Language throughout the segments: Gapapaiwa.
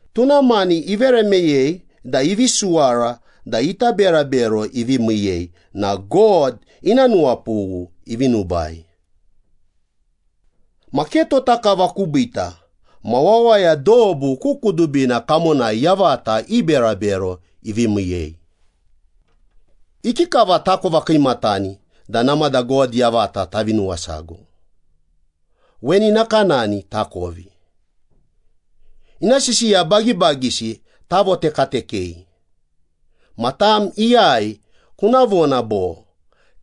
Tuna mani ivere meyei da ivi suwara da ita berabero ivi miiyei na God ina nuwapughu ivi nubai. Ma ke tota kava kubiita ma wawaya dobu ku kudubina kamonai yavata i berabero ivi miiyei. Ikikava takova kiimatani da namada God yavata tavi nuwasago? Weni nakanani takovi. Ina sisiya bagibagisi tavotekatekei. Ma tam iyai kuna vona bo,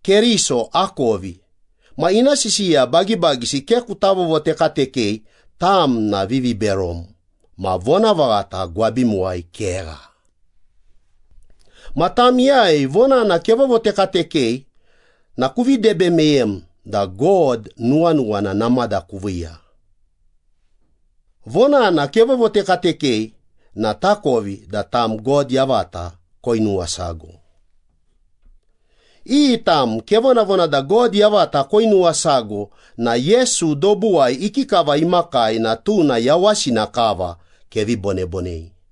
“Keriso akovi,” ma ina sisiya bagibagisi ke kuta vovotekatekei, tam na viviberom ma vonavaghata gwabimuwai kegha. Ma tam iyai vonana kevovotekatekei na kuvi debe meyem da God nuwanuwana namada kuviiya. Vonana kevovotekatekei na takovi da tam God yavata koinuwasago. Iyi tam kevonavona da God yavata koinuwasago na Yesu dobuwai ikikava imakai na tuna yawasina kava kevi bonebonei.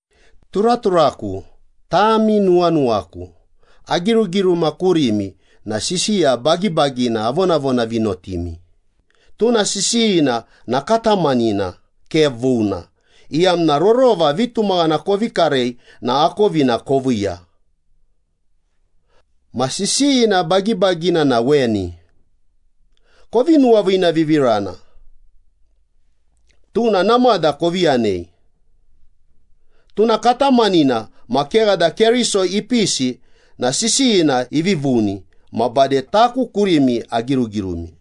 Turaturaku, tami nuwanuwaku. Agirugiruma kurimi na sisiya bagibagina avonavonavinotimi, tuna sisiyina na katamanina, ke vuna, iyamna rorova vitumaghana kovi karei na akovina koviiya. Ma sisiyina bagibagina na weni. “Kovi nuwaviinavivirana.” Tuna namada kovi yanei. Tuna katamanina ma kegha da Keriso ipisi na sisiyina ivi vuni ma bade taku kurimi agirugirumi.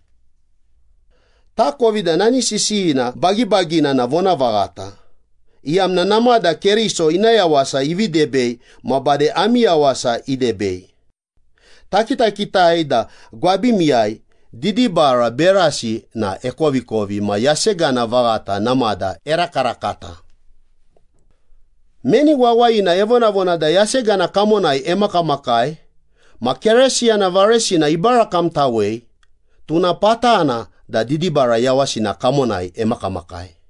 Takovi da nani sisiyina bagibagina na vonavaghata, iyamna namada Keriso ina yawasa ivi debei ma bade ami yawasa idebei. Takitakitai da gwabimiyai didibara berasi na ekovikovi ma yasegana vaghata namada erakarakata. Meni wawayina evonavona da yasegana kamonai emakamakai ma Keresiyana varesina ibarakamtawei, tuna patana da didibara yawasina kamonai emakamakai.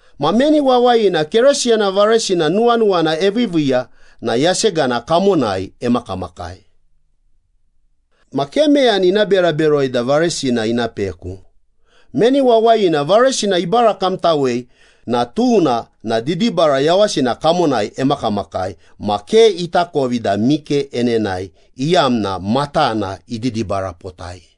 Ma meni wawayina Keresiyana varesina nuwanuwana eviiviiya na yasegana kamonai emakamakai. Ma ke meyani ina bera beroi da varesina ina peku. Meni wawayina varesina ibarakamtawei na tuna na didibara yawasina kamonai emakamakai ma ke itakovi da mike enenae, iyamna matana ididibarapotai.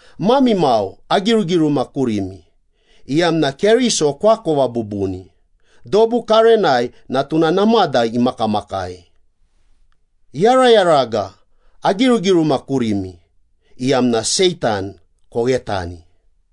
Mami mau, agirugiruma kurimi, iyamna Keriso koakova bubuni. Dobu karenai na tuna namada imakamakai. Yarayaraga, agirugiruma kurimi, iyamna Seitan koghetani.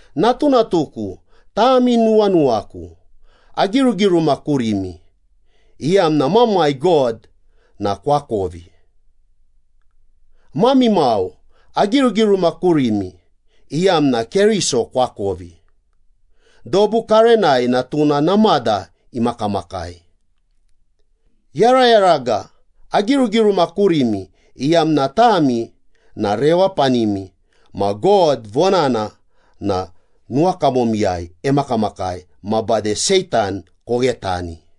Natunatuku, tami nuwanuwaku. Agirugiruma kurimi, iyamna Mamai God na koakovi. Mami mau, agirugiruma kurimi, iyamna Keriso koakovi. Dobu karenai na tuna namada imakamakai. Yarayaraga, agirugiruma kurimi, iyamna tami na rewapanimi ma God vonana na nuwakamomiyai emakamakai ma bade Seitan koghetani.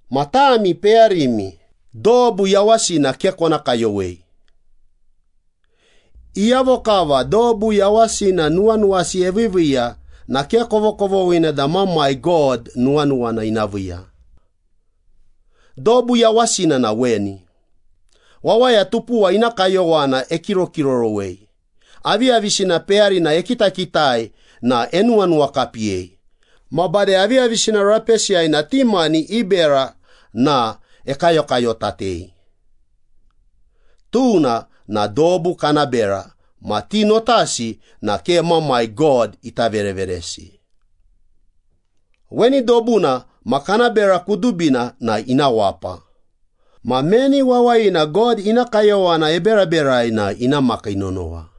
Ma tami peyarimi, dobu yawasina ke kona kayowei. Iyavo kava dobu yawasina nuwanuwasi eviiviiya na ke kovokovoghina da Mamai God nuwanuwana ina viiya. Dobu yawasina na weni. Wawaya tupuwa ina kayowana ekirokirorowei, aviyavisina peyarina ekitakitai na enuwanuwakapiyei, ma bade aviyavisina rapesiyai ma ti mani i bera na ekayokayotatei. Tuna na dobu kana bera ma ti notasi na ke Mamai God ita vereveresi. Weni dobuna ma kana bera kudubina na ina wapa, ma meni wawayina God ina kayowana eberaberai na ina makii nonowa.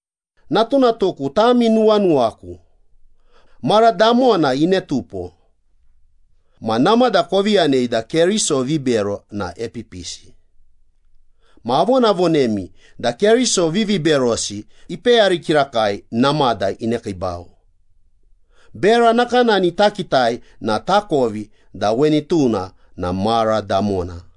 Natunatuku, tami nuwanuwaku. Mara damona inetupo. Ma namada kovi yanei da keriso vibero na epipisi. Ma avonavonemi da keriso viviberosi ipeyari kirakai namada inekiibau. Bera nakanani takitai na takovi da weni tuna na mara damona.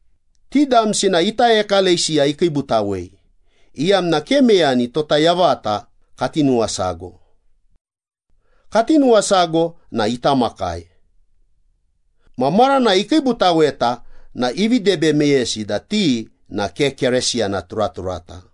Ti damsi na ita ekalesiya ikiibutawei, iyamna ke meyani tota yavata kati nuwasago. Kati nuwasago na ita makai. Ma maranai ikiibutaweta na ivi debe meyesi da ti na ke Keresiyana turaturata.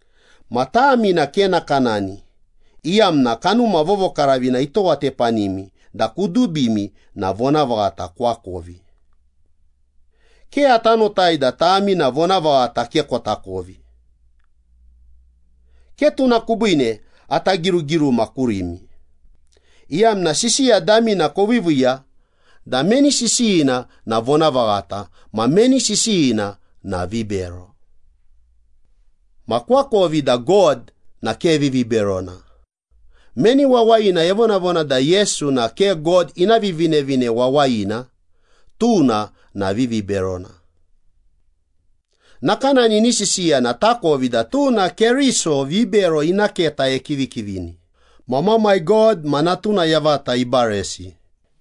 Ma tami na ke nakanani, iyamna Kanuma Vovokaravina itowatepanimi da kudubimi na vonavaghata koakovi. Ke ata notai da tami na vonavaghata ke kotakovi. Ke tuna kubiine ata girugiruma kurimi, iyamna sisiya damina koviiviiya da meni sisiyina na vonavaghata ma meni sisiyina na vibero. Ma koakovi da God na ke viviberona. Meni wawayina evonavona da Yesu na ke God ina Vivinevine Wawayina, tuna na viviberona. Nakanani ini sisiya na takovi da tuna keriso vibero ina keta ikivikivina, ma Mamai God ma Natuna yavata ibaresi.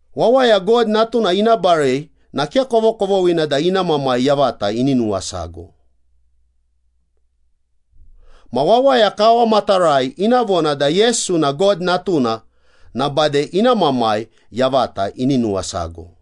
Wawaya God Natuna ina barei na ke kovokovoghina da ina Mamai yavata ini nuwasago. Ma wawaya kawamatarai ina vona da Yesu na God Natuna na bade ina Mamai yavata ini nuwasago.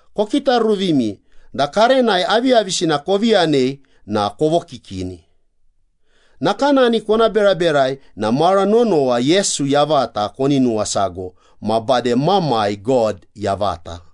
Kokitaruvimi da karenai aviyavisina kovi yanei na kovokikini. Nakanani kona beraberai na mara nonowa Yesu yavata koni nuwasago ma bade Mamai God yavata.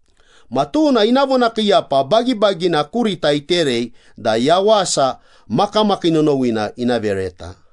Ma tuna ina vonakiiyapa bagibagina kurita iterei da yawasa makamakii nonowina ina vereta.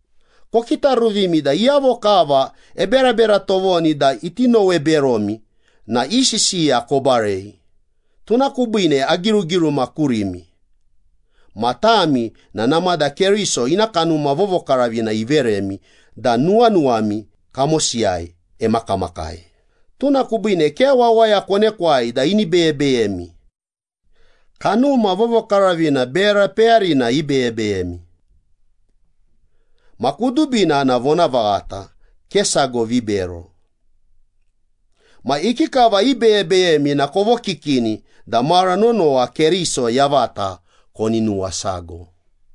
Kokitaruvimi da iyavo kava eberabera tovoni da iti nowe beromi na i sisiya kobarei, tuna kubiine agirugiruma kurimi. Ma tami na namada Keriso ina Kanuma Vovokaravina iveremi da nuwanuwami kamosiyai emakamakai, tuna kubiine ke wawaya konekwai da ini beyebeyemi. Kanuma Vovokaravina bera peyarina ibeyebeyemi. Ma kudubina na vonavaghata, ke sago vibero. Ma ikikava ibeyebeyemi na kovokikini da mara nonowa Keriso yavata koni nuwasago.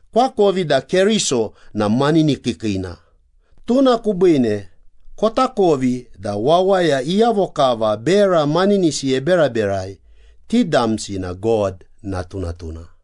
Koakovi da Keriso na maninikiikiina, tuna kubiine kotakovi da wawaya iyavo kava bera maninisi eberaberai, ti damsi na God natunatuna.